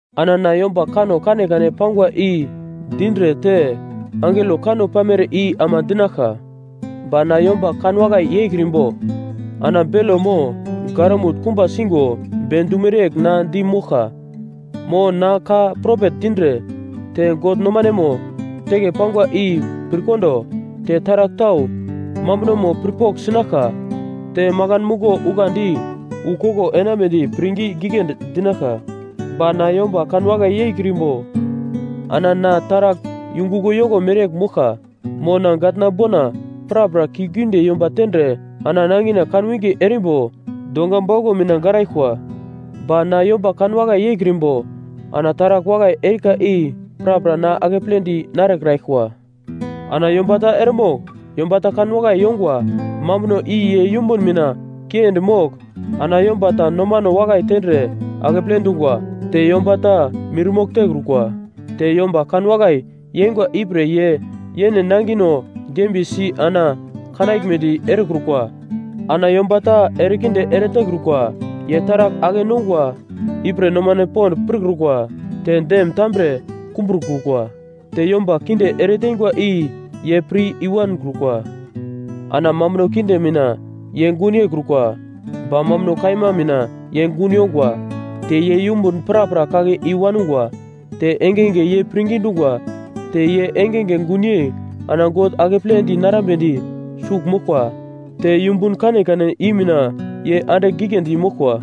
Ana na yomba kanno kanekane pangwa i dindre te angelo kanno pamere i ama dinaglka, ba na yomba kanwakai yeikrimbo, ana belo mo garamut kumba sigo be dumere yegl na di moglka. Mo na ka propet dindre, te God nomanemo teke pangwa i pirkondo, te taragl tau mambunomo pirpogl sinaglka, te makan muglo ukandi wu koglo enambedi pirngi giglendi dinaglka, ba na yomba kanwakai yeikrimbo ana na taragl yunguglo yoko mereyegl moglka. Mo na gatna bona prapra kiuglgiunde yomba tendre ana nangina kanwinge erimbo donga bauglo mina garaglkwa, ba na yomba kanwakai yeikrimbo ana taragl wakai erika i prapra na akepledi narekraglkwa. Ana yomba ta eremogl yomba ta kanwakai yongwa mambuno i ye yumbun mina kiendi mogl ana yomba ta nomano wakai tendre akeple dungwa. Te yomba ta mirmogl tekrukwa. Te yomba kanwakai yeingwa ipre ye yene nangino dembiyesi ana kanaglmedi erekrukwa. Ana yomba ta erekinde eretekrukwa. Ye taragl ake-nongwa ipre nomano pond pirkrukwa, te dem tambre kumbrokrukwa. Te yomba kinde ereteingwa i ye pir i-wankrukwa. Ana mambuno kinde mina ye gun yeikrukwa ba mambuno kaima mina ye gun yongwa. Te ye yumbun prapra kake i-wanugwa. Te engenge ye pirngi dungwa. Te ye engenge gunyei ana God akepledi narambedi sugl moglkwa. Te yumbun kanekane i mina ye andigl giglendi moglkwa.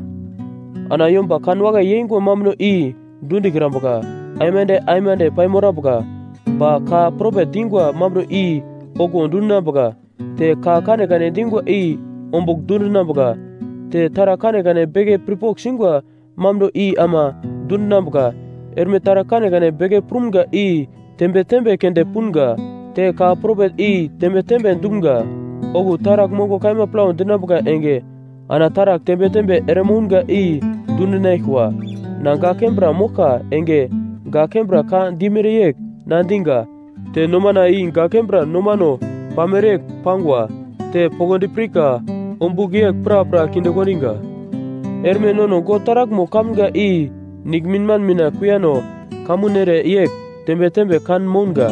Ana yomba kanwakai yeingwa mambuno i dundikrambuka, aimande aimande paimorambuka. Ba ka propet dingwa mambuno i okuwo dundinambuka. Te ka kanekane dingwa i ombugl dundinambuka; te taragl kanekane beke pirpogl singwa mambuno i ama dundinambuka. Erme taragl kanekane beke prumga i tembe tembe keunde punga; te ka propet i tembe tembe dumga. Okuwo taragl mongo kaima plau dinambuka enge ana taragl tembe tembe eremounga i dundinaglkwa. Na gak kembra moglka enge gak kembra ka dimere yegl na diga; te nomana i gak kembra nomano pamere yegl pangwa; te poglodi pirka ombugl yegl prapra kinde kondiga. Erme nono God taraglmo kamga i niglminman mina kuiyano kamun ere yegl tembe tembe kan mounga.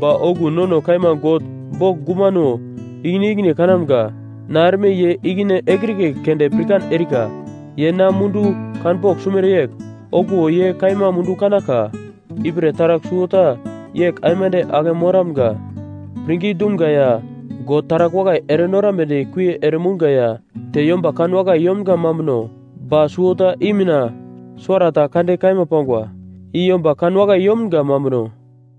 Ba okuwo nono kaima God bogl gumano ikine ikine kanamga. Na erme ye ikine ekrike keunde pirkan erika. Ye na mundu kanpogl sumere yegl, okuwo ye kaima mundu kanaglka. Ipre taragl suwota yegl aimande ake moramga; pirngi dumga ya, God taragl wakai erenorambedi kuie ere mounga ya te yomba kanwakai yomga mambuno. Ba suwota I mina suwarata kande kaima pangwa, i yomba kanwakai yomga mambuno.